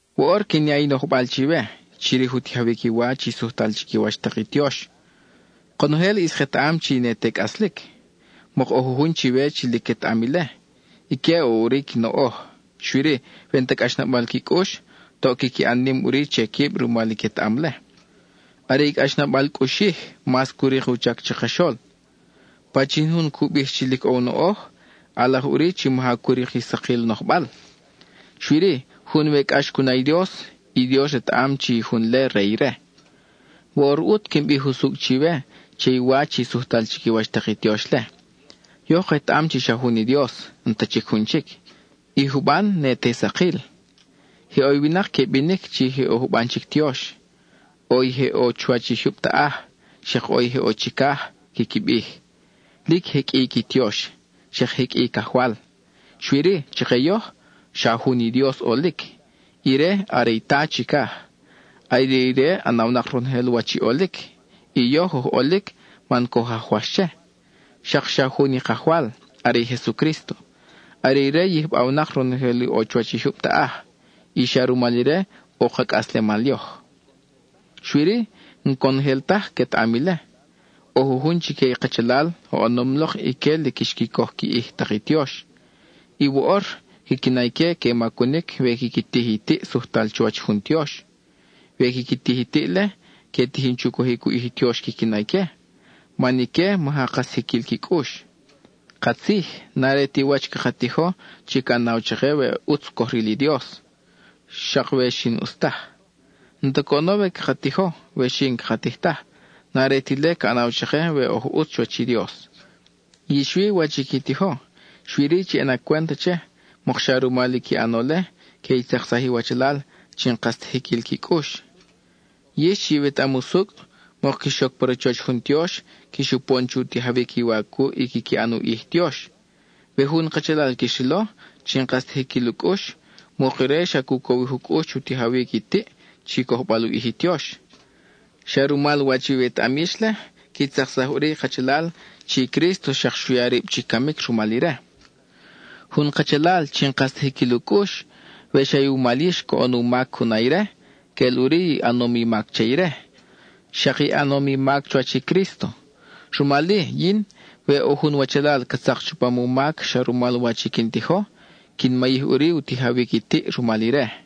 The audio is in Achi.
Woʼor quin ya i nojbal chiwe, chirij u tijawic i wa chi sujtal chiquiwach tak i tiox. Konojel ʼis ketaʼam chi ne te cʼaslic. Mok ʼo jujun chiwe chi lic quetaʼam ile; ique ʼo ʼuri qui noʼoj, xui-ri, we n-ta cʼaxnabal qui cʼux, toʼ quiqui ʼan nim ʼuri che quib rumal i quetaʼam-le. Are i cʼaxnabal cʼuxij mas cu rik u chac chakaxol. Pachin jun cu bij chi lic ʼo u noʼoj, ʼalaj ʼuri chi maja cu rik i sakil nojbal. Xui-ri, jun we cʼax cu na i Dios, i Dios retaʼam chi i jun-le re ire. Woʼor ʼut quin bij usucʼ chiwe che i wa chi sujtal chiquiwach tak i tiox-le: yoj ketaʼam chi xa jun i Dios, n-ta chic jun chic; i juban ne te sakil. Je ʼo i winak que binic chi je ʼo juban chic tiox: ʼo i je ʼo chuwach i jyub taʼaj, xak ʼo i je ʼo chicaj, quiqui bij. Lic je qʼui i qui tiox, xak je qʼui i cajwal. Xui-ri, chake yoj, xa jun i Dios ʼolic, ire are i Ta chicaj. Are ire ʼanawnak ronojel wach i ʼolic, y yoj oj ʼolic man coj ajwax che. Xak xa jun i Kajwal, are i Jesucrísto. Are ire yijbawnak ronojel i ʼo chuwach i jyub taʼaj, y xa rumal ire ʼo ka cʼaslemal yoj. Xui-ri, n-conojel taj quetaʼam ile. ʼO jujun chique i kachalal, oʼonom lok ique lic xqui coj qui ʼij tak i tiox, y woʼor, quiqui na ique que macunic we quiqui tij i tiʼ sujtal chuwach jun tiox. We quiqui tij i tiʼ-le, que tijin chu cojic u ʼij i tiox quiqui na ique, man ique maja kas jiquil qui cʼux. Katzij, n-are ti wach i caka tijo chi ca ʼanaw chake we ʼutz coj ril i Dios, xak we xi n-ʼus taj. N-ta coʼono we caka tijo, we xi n-caka tij taj; n-are ti ile ca ʼanaw chake we oj ʼutz chuwach i Dios. Yix wi, wach i qui tijo, xui-ri, chi ʼana cwent che, mokxa rumal i qui ʼano-le, que i tzaksaj i iwachalal chi n-kas ta jiquil qui cʼux. Yix chi iwetaʼam usucʼ, mok quix oc pa rachoch jun tiox, quix upon chu tijawic i wa cuʼ i quiqui ʼan u ʼij i tiox. We jun kachalal quix rilo, chi n-kas ta jiquil u cʼux, mok ire xa cu cowij u cʼux chu tijawic i tiʼ chi cojbal u ʼij i tiox. Xa rumal wach iwetaʼam yix-le, qui tzaksaj ʼuri i kachalal chi Crísto xak xu ya rib chi camic rumal ire. Jun kachalal chi n-kas ta jiquil u cʼux, we xa iwumal yix coʼon u mac cu na ire, queʼel ʼuri i ʼanom i mac che ire, xak i ʼanom i mac chuwach i Crísto. Rumal-i, yin, we ʼo jun wachalal ca tzak chupam u mac xa rumal wach i quin tijo, quin mayij ʼuri u tijawic i tiʼ rumal ire.